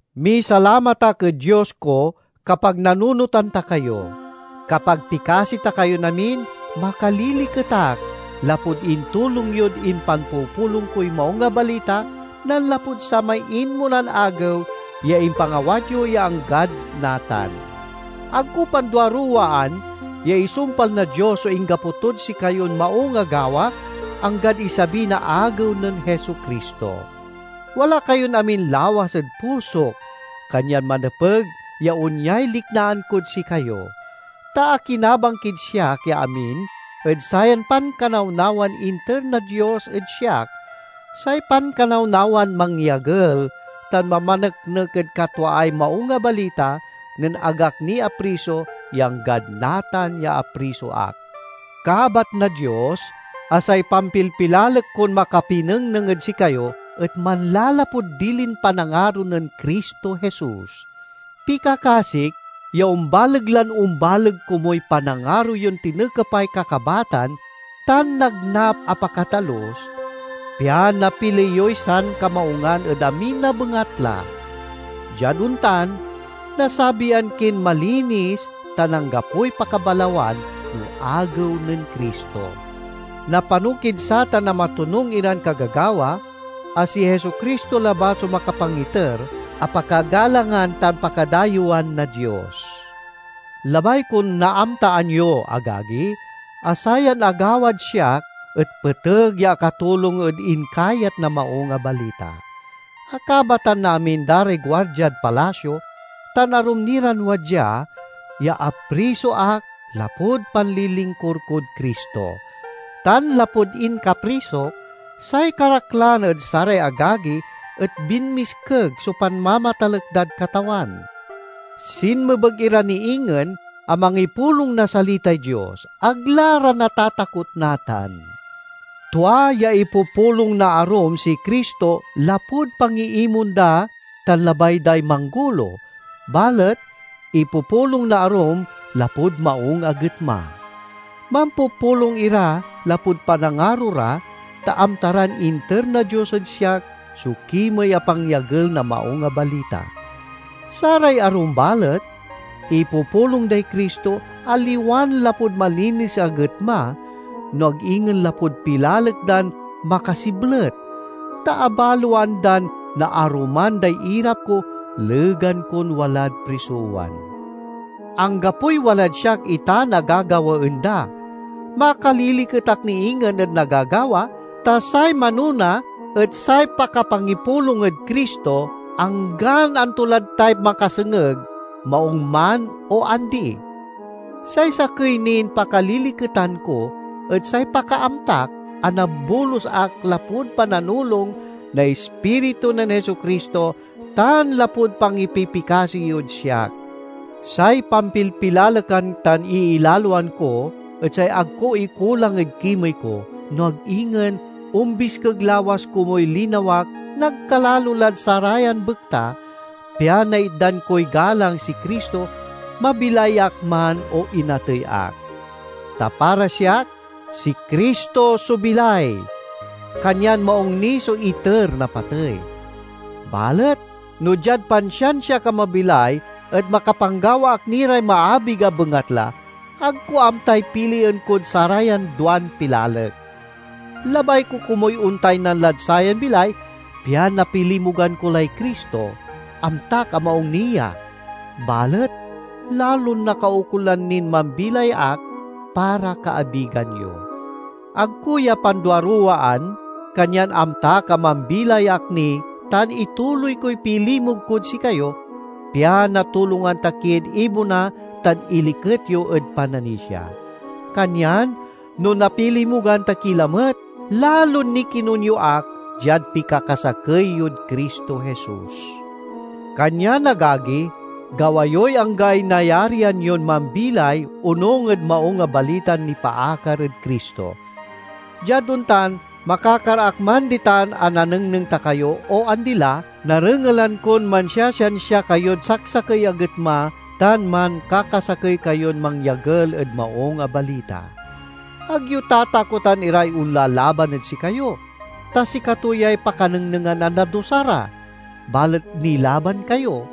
Misalamat ak ed Dios ko kapag nanunotan ta kayo. Kapag pikasi ta kayon amin, makaliliket ak, lapud intulong yod impanpupulong koy Maung a Balita, nanlapud samay inmonan agew ya impangawat yo ya anggad natan. Ag ko panduaruwaan ya isumpal na Dios so inggapo tod sikayon maung a gawa, anggad isabi na Agew nen Jesu-Cristo. Wala kayon amin lawas ed pusok, kanyan manepeg ya onyay liknaan kod sikayo. Ta akinabang kid siak ya amin ed sayan pankanawnawan inter na Dios ed siak, say pankanawnawan mangyagel tan mamaneknek ed katwaay Maung a Balita, nen ag ak ni apriso ya anggad natan ya apriso ak. Kabat na Dios a say pampilpilalek kon makapinengneng ed sikayo et manlalapud dilin panangaro nen Cristo Jesus. Pikakasik ya ombaleg lan ombaleg komuy panangaro yon tinekepay kakabatan tan nagnap a pakatalus, pian napili yoy sankamaungan ed amin a bengatla. Diad ontan nasabian kin malinis tan anggapoy pakabalawan no Agew nen Cristo. Napano kid satan na matonung iran kagagawa a si Jesu-Cristo labat so makapangiter, a pakagalangan tan pakadayewan na Dios. Labay kon naamtaan yo, agagi, a sayan agawad siak et peteg ya akatulong ed inkayat na Maung a Balita. Akabatan na amin da ray guardiad palasio tan arum ni ran wadya ya apriso ak lapud panlilingkur kod Cristo. Tan lapud inkaprisok, say karaklan ed saray agagi et binmiskeg so panmamatalek dad Katawan. Sinmebeg ira ni ingen a mangipulong na salitay Dios; ag la ra natatakot natan. Tua ya ipupulong na arum si Cristo lapud pangiimon da tan labay day manggolo, balet ipupulong na arum lapud maung a getma. Mampupulong ira lapud panangaro ra, ta amta ran inter na Dios ed siak so kimey a pangyagel na Maung a Balita. Saray arum balet ipupulong day Cristo, aliwan lapud malinis a getma, no ag ingen lapud pilalek dan makasiblet, ta abaloan dan naaruman day irap ko legan kon walad prisowan. Anggapoy walad siak itan a gagawaen da! Makaliliket ak ni ingen ed nagagawa, ta say manona et say pakapangipulong ed Cristo, anggan anto lad tay makasengeg, maung man o andi. Say sakey nin pakaliliketan ko et say pakaamtak a nabolus ak lapud pananulong na Ispiritu nen Jesu-Cristo tan lapud pangipipikasi yod siak. Say pampilpilalekan tan iilaloan ko et say ag ko ikulang ed kimey ko, no ag ingen ombiskeg lawas komuy linawak nagkalalo lad sarayan bekta, pian naitdan koy galang si Cristo, mabilay ak man o inatey ak. Ta para siak si Cristo so bilay, kanyan maung ni so iter na patey. Balet no diad pansiansiak a mabilay et makapanggawa ak ni ray maabig a bengatla, ag ko amtay pilien kod sarayan duan pilalek. Labay ko komuy ontaynan lad sayan bilay pian napilimugan ko lay Cristo; amtak a maung ni ya. Balet lalon nakaukolan nin mambilay ak para kaabigan yo. Ag ko ya panduaruwaan, kanyan amtak a mambilay ak ni tan ituloy koy pilimug kod sikayo, pian natulongan ta kid ibona tan iliket yo ed pananisia. Kanyan no napilimugan ta ki lamet, lalon nikinun yo ak diad pikakasakey yod Cristo Jesus. Kanyan, agagi, gawa yoy anggaay nayarian yon mambilay onung ed Maung a Balitan nipaakar ed Cristo. Diad ontan, makakar ak man ditan a nanengneng ta kayo o andi la, narengelan kon mansiasiansia kayod saksakey a getma tan mankakasakey kayon mangyagel ed Maung a Balita. Ag yo tatakotan iray onlalaban ed sikayo, ta sikato yay pakanengnengan a nadusa ra, balet nilaban kayo,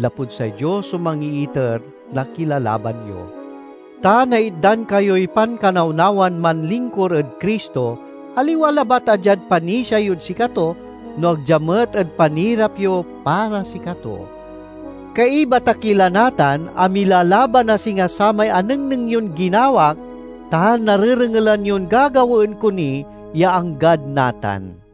lapud say Dios so mangiiter na kilalaban yo. Ta naitdan kayoy pankanawnawan manlingkur ed Cristo, aliwa labat a diad panisia yod sikato, no ag dia met ed panirap yo para sikato. Kaiba ta ki la natan a milalaban a singa samay anengneng yon ginawak tan narerengelan yon gagawaen ko ni ya anggad natan.